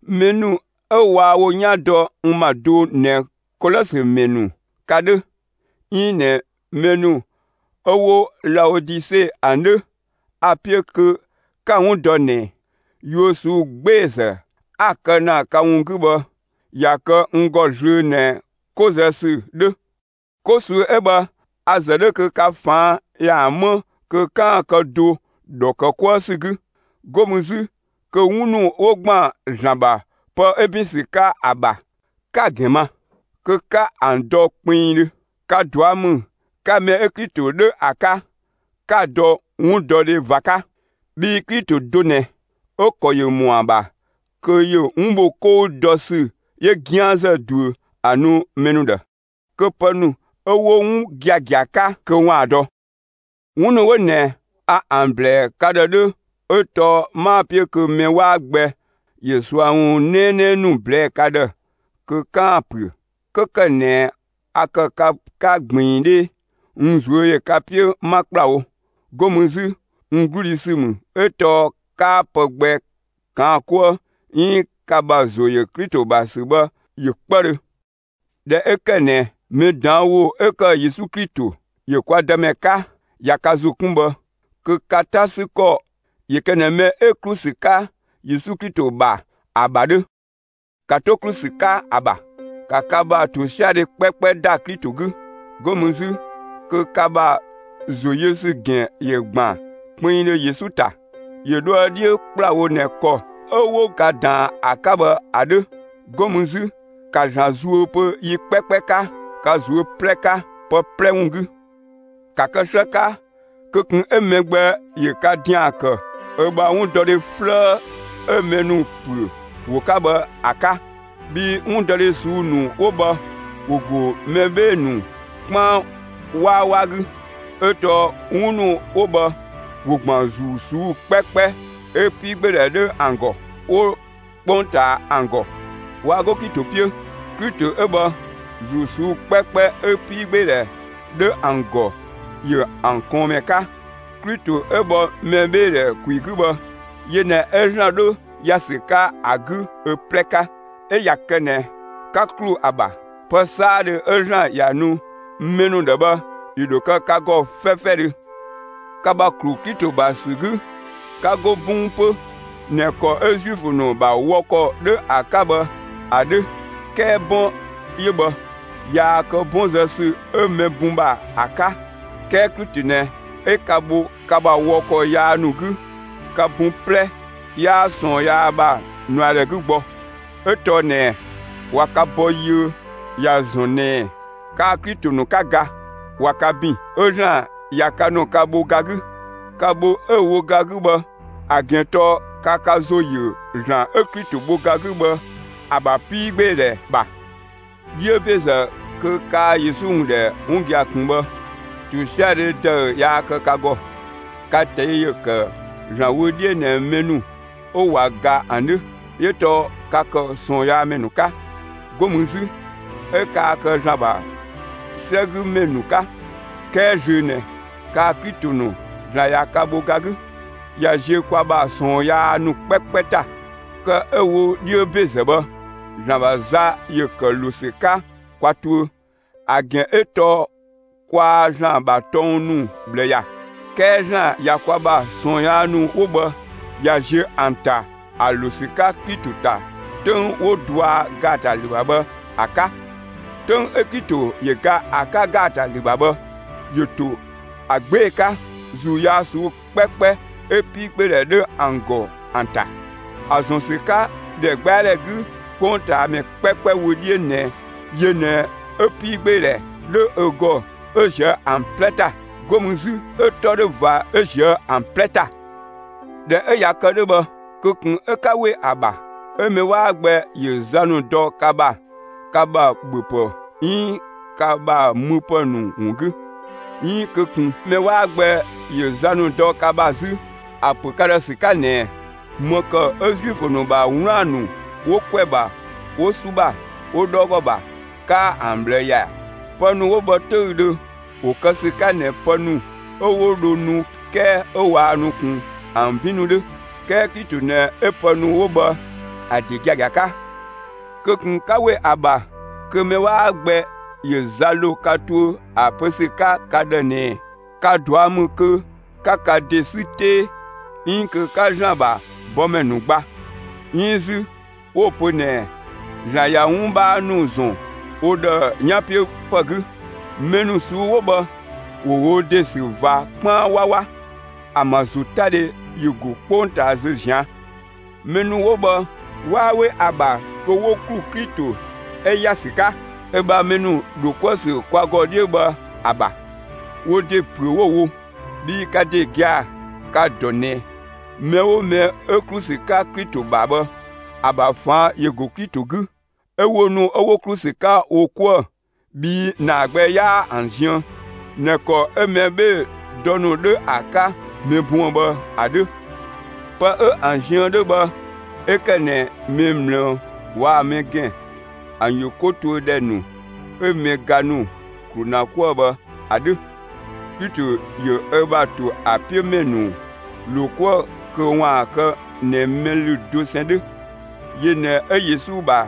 Mɛ ‑nu 'ö waa wo 'yan dɔ n ‑ma do ꞊nɛ Kolɔsö ‑mɛ ‑nu ka 'dhö, 'iin ꞊nɛ mɛ ‑nu 'ö 'wo Laodise ‑an 'dhö, a‑ 'piö kö 'ka‑ 'wun dɔ ꞊nɛ, yuö ꞊suu'‑ 'gbeezë 'a‑ kë ‑na ka ‑wun 'gü bhë, ꞊ya kë n ‑gɔ zlöö ꞊nɛ 'ko zë ‑sü 'dhö. 'Ko ꞊suu'‑ 'ö bhë, 'a‑ ‑zë 'dhö kö ka ꞊faan' ‑yaan 'më kö 'kaan‑ kë do ‑dhɔ ‑kë 'kuë ‑sü 'gü. 'Go mü 'zü, kö 'wun ‑nu 'wo ‑gban ‑Zlan ‑bha pë 'ö ‑bin ‑sü 'ka ‑an ‑bha, 'ka‑ ‑gɛn ma, kö 'ka ‑an dɔ kpinngdhö. Ka ꞊dua' ‑mü 'ka mɛ 'ö Klito 'dhö ‑a 'ka, 'ka‑ dɔ 'wundɔdhe ꞊va 'ka. Bhii Klito do ꞊nɛ, 'ö‑ ‑kɔ ‑yö ‑mɔa ‑bha kö ‑yö 'wun bho 'kɔu dɔ ‑sü 'yö 'gianzë ꞊duö ‑a nu mɛ ‑nu ‑dhë, kö pë ‑nu 'ö 'wo 'wun giagia 'ka kö ‑waan dɔ. 'Wun ‑nu 'wo ꞊nɛ a ‑an ‑blɛɛ ka ‑dhë 'dhö 'ö tɔɔ 'maa‑ 'piö kö mɛ 'waa gbɛ ‑yö ꞊sua ‑wun 'nɛɛnɛɛ ‑nu ꞊blɛɛ'‑ ka ‑dhë kö 'kaan‑ ‑püö. 'Kö ‑kë ꞊nɛ a ‑kë ka 'ka ꞊gbiin 'dhee, n ꞊zuö' ‑yö ka 'piö 'ma ‑kplawo. 'Go mü 'zü, n 'gludhi ‑sü ‑mü 'ö tɔɔ 'kaa pë gbɛ ꞊kaan' 'kuë 'iin ka ‑bha ‑zo ‑yö Klito ‑bha ‑sü bhë ‑yö 'kpëdhö. ꞊Dhɛ 'ö ‑kë ꞊nɛ mɛ ꞊daan' ‑wo 'ö ‑kë Yesu Klito, ‑yö kwa Dëmɛ 'ka, ꞊ya ka ‑zo 'kun bhë, kö ka 'ta ‑sü ‑kɔ ‑yö kë ꞊nɛ mɛ 'ö ‑klu ‑sü 'ka Yesu Klito ‑bha ‑a ‑bha 'dhö. ‑Ka 'to ‑klu ‑sü 'ka ‑a ‑bha; ‑ka ka ‑bha ‑tosiadhe 'kpɛkpɛ ‑da Klito 'gü! 'Go mü 'zü, kö ka ‑bha ‑zoyösü ‑gɛn ‑yö ‑gban kpinngdhö Yesu ‑ta, ‑yö dhoë 'dhiö ‑kplawo ꞊nɛ ‑kɔ 'ö 'wo ka ꞊daan ‑a 'ka bhë ‑a 'dhö. 'Go mü 'zü, ‑ka ‑Zlan zuö pö yi 'kpɛkpɛ 'ka, ka ꞊zuö' 'plɛ 'ka, pë 'plɛ ‑wun 'gü! ‑Ka kë 'slë 'ka kö ꞊kun 'ö mɛ gbɛ ‑yö ka ‑dian ‑kë ö ‑bha 'wundɔdhe 'flëë 'ö mɛ ‑nu ‑püö ‑wo 'ka bhë ‑a 'ka! Bhii 'wundɔdhe ꞊suu'‑ ‑nu 'wo bhë, ‑wo ‑go mɛ 'bhee‑ ‑nu 'kpaan 'wawa 'gü; 'ö tɔɔ 'wun ‑nu 'wo bhë, ‑wo ‑gban ‑zuu ꞊suu'‑ 'kpɛkpɛ 'ö 'piigbeedhɛ 'dhö ‑an ‑gɔ 'wo 'kpongtaa ‑an ‑gɔ. Waa 'go Klito 'piö. Klito 'ö bhë, ‑zuu ꞊suu'‑ 'kpɛkpɛ 'ö 'piigbeedhɛ 'dhö ‑an ‑gɔ, ‑yö ‑an ꞊kɔɔnmɛ 'ka. Klito 'ö bhɔ mɛbheedhɛ ‑kwi 'gü bhë, yö ꞊nɛ 'ö ‑Zlan 'dhö ‑ya ‑sü 'ka ‑a 'gü ö 'plɛ 'ka. 'Ö ꞊ya kë ꞊nɛ, 'ka ‑klu ‑a ‑bha, pë 'saadhö 'ö ‑Zlan ‑ya nu mɛ ‑nu ‑dhë bhë, ‑yö ‑dho kë ka ‑gɔ 'fɛfɛdhö. Ka ‑bha 'klu Klito ‑bha ‑sü 'gü, 'ka go 'bɔng 'pö ꞊nɛ ‑kɔ 'ö Zuifö ‑nu ‑bha wɔ ‑kɔ 'dhö ‑a 'ka bhë ‑a 'dhö. 'Kɛɛ 'bɔn 'yö bhë, yaa kë 'bɔn zë ‑sü 'ö mɛ bun ‑bha ‑a 'ka; 'kɛɛ Klito ꞊nɛ 'ö ka bho ka ‑bha wɔ ‑kɔ yaa ‑nu 'gü; ka bun 'plɛ 'yaa ꞊sɔɔn yaa ‑bha ꞊nuadhɛ 'gü gbɔ. 'Ö tɔɔ ꞊nɛɛ, ꞊wa ka bɔ yiö; ‑ya ‑zɔn ꞊nɛɛ kaa‑ Klito ‑nu 'ka ga. ꞊Wa ka ‑bin 'ö ‑Zlan ꞊ya ka ‑nu ka bho ga 'gü. Ka bho 'ö‑ wo ga 'gü bhë, ‑a ‑gɛn tɔɔ ka ka ‑zo ‑yö ‑Zlan 'ö Klito bho ga 'gü bhë, ‑a ‑bha 'piigbeedhɛ ‑a ‑bha. 'Dhiö ‑bezë (kö kaa Yesu ‑wun ‑dhɛ 'wun gia‑ ꞊kun bhë), ‑tosiadhe ‑dëü yaa kë ka ‑gɔ. Ka ꞊tɛi' ‑yö ‑kë ‑Zlan wö 'dhiö ꞊nɛ mɛ ‑nu 'ö ꞊wa ga ‑an 'dhö. 'Yö tɔɔ ka ‑kë ꞊sɔɔnyaamɛ ‑nu 'ka. 'Go mü 'zü, 'ö kaa kë ‑Zlan ‑bha 'sɛgümɛ ‑nu 'ka. 'Kɛɛ zlöö ꞊nɛ, kaa‑ Klito ‑nu ‑Zlan ꞊ya ka bho ga 'gü; ꞊ya ziö kwa ‑bha ꞊sɔɔn yaa ‑nu 'kpɛkpɛ ‑ta. Kë 'ö‑ wo 'dhiö ‑bezë bhë, ‑Zlan ‑bha za ‑yö ‑kë ‑lo ‑sü 'ka kwa tuö. ‑A ‑gɛn 'ö tɔɔ kwaa ‑Zlan ‑bha tɔng ‑nu ꞊bhlë ‑ya. 'Kɛɛ ‑Zlan ꞊ya kwa ‑bha ꞊sɔɔn yaa ‑nu 'wo bhë, ꞊ya ziö ‑an ‑ta ‑an ‑lo ‑sü 'ka Klito ‑ta, 'töng 'wo‑ ꞊dua' ‑gaatalü ‑bha bhë ‑a 'ka. 'Töng 'ö Klito ‑yö ga ‑a 'ka ‑gaatalü ‑bha bhë, ‑yö ‑to ‑a 'gbee‑ 'ka, ‑zuu yaa ꞊suu'‑ 'kpɛkpɛ 'ö 'piigbeedhɛ 'dhö ‑an ‑gɔ ‑an ‑ta, ‑a ‑zɔn ‑sü 'ka ‑dhɛgbɛadhɛ 'gü 'kpongtaamɛ 'kpɛkpɛ wö 'dhiö ꞊nɛ yö ꞊nɛ 'ö 'piigbeedhɛ 'dhö ö ‑gɔ 'ö ꞊zië' ‑an 'plɛ ‑ta. 'Go mü 'zü 'ö‑ 'tɔ 'dhö ꞊va 'ö ꞊zië' ‑an 'plɛ ‑ta. ꞊Dhɛ 'ö ꞊ya kë 'dhö bhë, kö ꞊kun 'ö 'ka 'we ‑a ‑bha 'ö mɛ 'waa gbɛ ‑yö za ‑nu dɔ ka ‑bha, ka ‑bha ‑bhöpë 'iin ka ‑bha müpë ‑nu ‑wun 'gü. 'Iin kö ꞊kun mɛ 'waa gbɛ ‑yö za ‑nu dɔ ka ‑bha 'zü, ‑a ‑pö ka ‑dhë ‑sü 'ka ꞊nɛɛ: ‑Më ‑kë 'ö Zuifö ‑nu ‑bha 'wlaan‑ ‑nu 'wo ‑kwɛ ‑bha, 'wo 'su ‑bha, 'wo 'dhɔɔgɔ ‑bha, 'kaa ‑an ꞊bhlë ‑ya ‑ɛ? Pë ‑nu 'wo bhë 'töüdhö, ‑wo kë ‑sü 'ka ꞊nɛ pë ‑nu 'ö 'wo dho nu 'kɛɛ 'ö waa nu ꞊kun ‑an 'bin ‑nu 'dhö. 'Kɛɛ Klito ꞊nɛ 'ö pë ‑nu 'wo bhë ‑a ‑de giagia 'ka. Kö ꞊kun 'ka ‑we ‑a ‑bha kö mɛ 'waa gbɛ ‑yö za ‑lo ka tuö ‑a ‑pö ‑sü 'ka ka ‑dhë ꞊nɛɛ: Ka ꞊dua' ‑mü kö 'ka ka ‑de 'sü 'tee 'iin kö 'ka ‑Zlan ‑bha bɔmɛ ‑nu gba. 'Iin 'zü 'wo‑ pö ꞊nɛɛ ‑Zlan ꞊ya 'wun 'bhaa ‑nu ‑zɔn wo ‑dhë 'yanpiöpë 'gü. Mɛ ‑nu ꞊suu'‑ 'wo bhë, ‑wo wo ‑de ‑sü ꞊va 'kpaan 'wawa. ‑An ‑bha ‑zotadhe ‑yö ‑go 'kpongtaa zö ꞊zian'. Mɛ ‑nu 'wo bhë 'waa 'we ‑a ‑bha kö 'wo ‑klu Klito 'ö ‑ya ‑sü 'ka ö ‑bha mɛ ‑nu ‑dho 'kuë‑ ‑sü kwa ‑gɔ 'dhiö bhë ‑a ‑bha. (Wo ‑de ‑püö 'wo‑ wo). Bhii ka ‑de gia‑ ka‑ ‑dɔ ꞊nɛ, mɛ 'oo mɛ 'ö ‑klu ‑sü 'ka Klito ‑bha bhë, ‑a ‑bha ꞊faan' ‑yö ‑go Klito 'gü, 'ö wo ‑nu 'wo ‑klu ‑sü 'ka wo 'kuë‑ bhii ‑naa gbɛ 'yaa ‑an ziën ꞊nɛ ‑kɔ 'ö mɛ 'bhee‑ dɔ ‑nu 'dhö ‑a 'ka mɛ buën‑ bhë ‑a 'dhö; pë 'ö ‑an ziën 'dhö bhë 'ö ‑kë ꞊nɛ mɛ ꞊mlëë waa‑ mɛ ‑gɛn ‑an ‑yö 'ko tuö ‑dhɛ ‑nu 'ö mɛ ga ‑nu ‑klu ‑na 'kuë‑ bhë ‑a 'dhö. Klito ‑yö ö ‑bha ‑to ö 'piö ‑mɛ ‑nu ‑lo 'kuë‑ kö ‑waan kë ꞊nɛ mɛ ‑lü dosɛn 'dhö. Yö ꞊nɛ 'ö Yesu ‑bha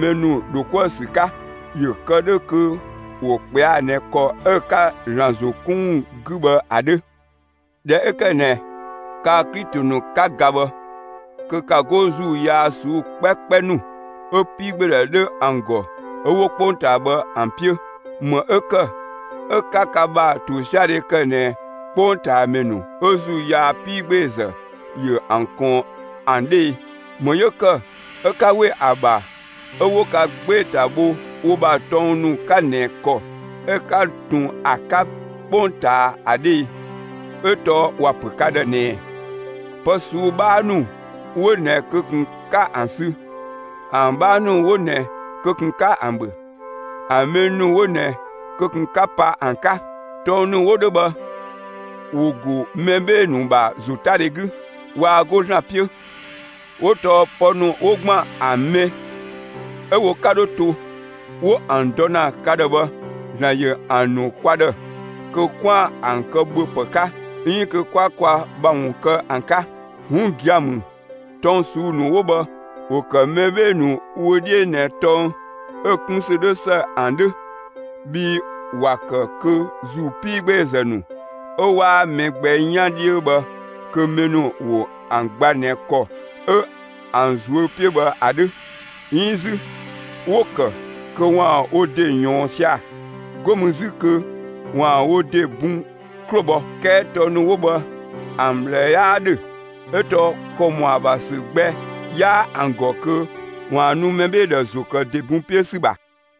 mɛ ‑nu ‑dho 'kuë‑ ‑sü 'ka, ‑yö kë 'dhö kö ‑wo ꞊kpɛa' ꞊nɛ ‑kɔ 'ö‑ 'ka ‑Zlan ‑zo 'kun ‑wun 'gü bhë ‑a 'dhö. ꞊Dhɛ 'ö ‑kë ꞊nɛ kaa‑ Klito ‑nu 'ka ga bhë, kö 'ka 'go ‑zuu yaa ꞊suu'‑ 'kpɛkpɛ ‑nu 'ö 'piigbeedhɛ 'dhö ‑an ‑gɔ 'ö 'wo 'kpongtaa bhë ‑an 'piö. ‑Më 'ö ‑kë 'ö 'ka ka ‑bha ‑tosiadhe ‑kë ꞊nɛ 'kpongtaamɛ ‑nu 'ö ‑zuu yaa 'piigbeezë ‑yö ‑an ꞊kɔɔn ‑an 'dhö e? ‑Më 'yö ‑kë 'ö 'ka ‑we ‑a ‑bha 'ö 'wo ka 'gbee‑ ‑ta bho wo ‑bha tɔng ‑nu 'ka ꞊nɛ ‑kɔ 'ö 'ka ꞊tun ‑a 'ka 'kpongtaa ‑a 'dhö e? 'Ö tɔɔ ‑wa ‑pö ka ‑dhë ꞊nɛɛ: «Pë ꞊suu'‑ 'bhaa ‑nu 'wo ꞊nɛ kö ꞊kun 'ka ‑an sü, ‑an 'bhaa ‑nu 'wo ꞊nɛ kö ꞊kun 'ka ‑an ‑bhö, ‑an mɛ ‑nu 'wo ꞊nɛ kö ꞊kun 'ka pa ‑an 'ka!» Tɔng ‑nu 'wo 'dhö bhë, ‑wo ‑go mɛ 'bhee‑ ‑nu ‑bha ‑zotadhe 'gü, waa 'go ‑Zlan 'piö, 'wo tɔɔ pë ‑nu 'wo ‑gban ‑an mɛ 'ö wo 'ka dho to, 'wo ‑an dɔ ‑na ka ‑dhë bhë; ‑Zlan ‑yö ‑an ‑nu kwa ‑dhë, kö 'kwaan‑ ‑an kë ‑bhöpë 'ka 'iin kö 'kwa kwa ‑bha ‑wun kë ‑an 'ka. 'Wun gia‑ ‑mü, tɔng ꞊suu'‑ ‑nu 'wo bhë, ‑wo ‑kë mɛ 'bhee‑ ‑nu wö 'dhiö ꞊nɛ tɔng 'ö‑ 'kun ‑sü 'dhö ‑së ‑an 'dhö. Bhii ‑wa ‑kë kö ‑zuu 'piigbeezë ‑nu, 'ö 'waa mɛ gbɛ 'yan 'dhiö bhë kö mɛ ‑nu ‑wo ‑an gba ꞊nɛ ‑kɔ 'ö ‑an ꞊zuö' 'piö bhë ‑a 'dhö. 'Iin 'zü, 'wo‑ ‑kë kö ‑waan wo ‑de ꞊yɔɔn sia‑. 'Go mü 'zü kö ‑waan wo ‑de bun 'klo bhɔ. 'Kɛɛ tɔng ‑nu 'wo bhë, ‑an ꞊bhlë 'yaa 'dhö, 'ö tɔɔ ‑kɔ ‑mɔa ‑bha ‑sü gbɛ 'yaa ‑an ‑gɔ kö ‑waan nu mɛ 'bhee‑ ‑dhë ‑zo ‑kë ‑de bun 'piö ‑sü ‑bha.